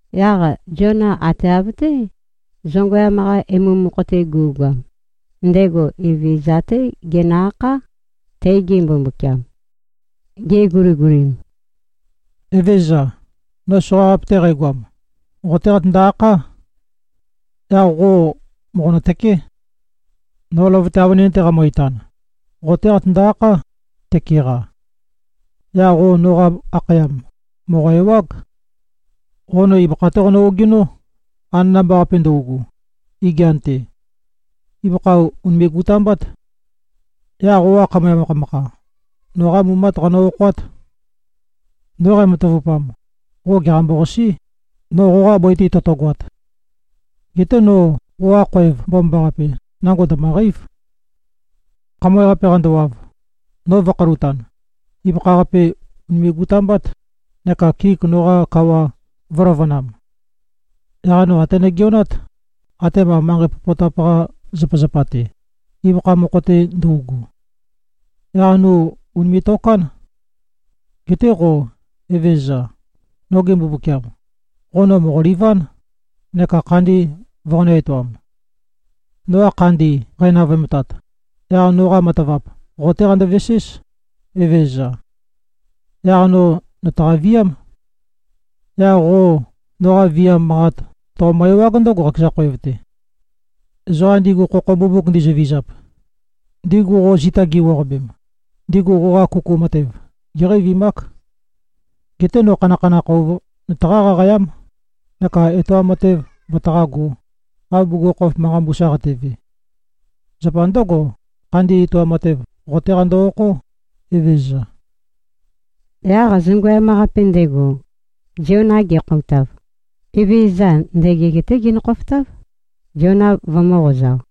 Yaq Ziona ate av-té zongøyam-qa emu mokho-te gu꞉goam, ndego Evezøza-té genø-akhá, tege Mbumbukiam. Geguligulim, “Evezøza, no soqaqape-te qægoam, qo-té qatøndo-akhá. Yaq qo mòqonø-tøké. No løvøte avønin-te qæmø-itan, qo-té qatøndo-akhá, tøke-qa. Yaq qo noqa akhayam mòqo-ewág. Qo no ibøkha-té qonø-ogenó, anana-mba-qape ndøugu, igian-te. Ibøkha ùnime꞉-gutambát. Yaq qoqa khamøe makhamakha, noqá mumát qanø-okhoát. No qæmatavupam, qo gèqambo-qasí, no qoqa bøi-te totogoat. Geté no qoqa khoev mbomambaqape, nango ndø̀møqeív. Khamøe-qape qandowav, no vø̄khølutan, ibøkha-qape ùnime꞉-gutambát, neka kik noqa kawa vø̄løvønam. Yaq no até nogeonát, atema manqei popotap-qa zapazapa-te, ibøkha mokho-te ndøugu. Yaq no ùnime꞉-tokán. Geté qo, Evezøza, noge Mbumbukiam, qo no mòqoliván, neka khandi voqonø̄-etoam. Noqa khandi qænavøemtat, yaq noqa matavap qo-té qandoveséz, Evezøza. Yaq no nø̀taqa-viám. Yaq qo noqa viam manqat toqomø-ewág ndǿgo, qakeza khoev-te. Ezoqa ndigu khokho mbumbuk ndizøvizap, ndigu qo zita gi꞉wuaqabem, ndigu qoqa kuku matev géqeivimák. Geté no khanakhanakh ouv nøtaqá-qaqayám, neka etoam matev vøtaqágō, av bugukhokhof manqa mbusa qateve. Zapa ndǿgo, khandi etoam matev, qo-té qando-okhó, Evezøza.” Yaq zongøyam-qape ndego, Ziona gekhoutav, Evezøza ndøgeg-té genø-khofotáv, Ziona vømø̄-qozao.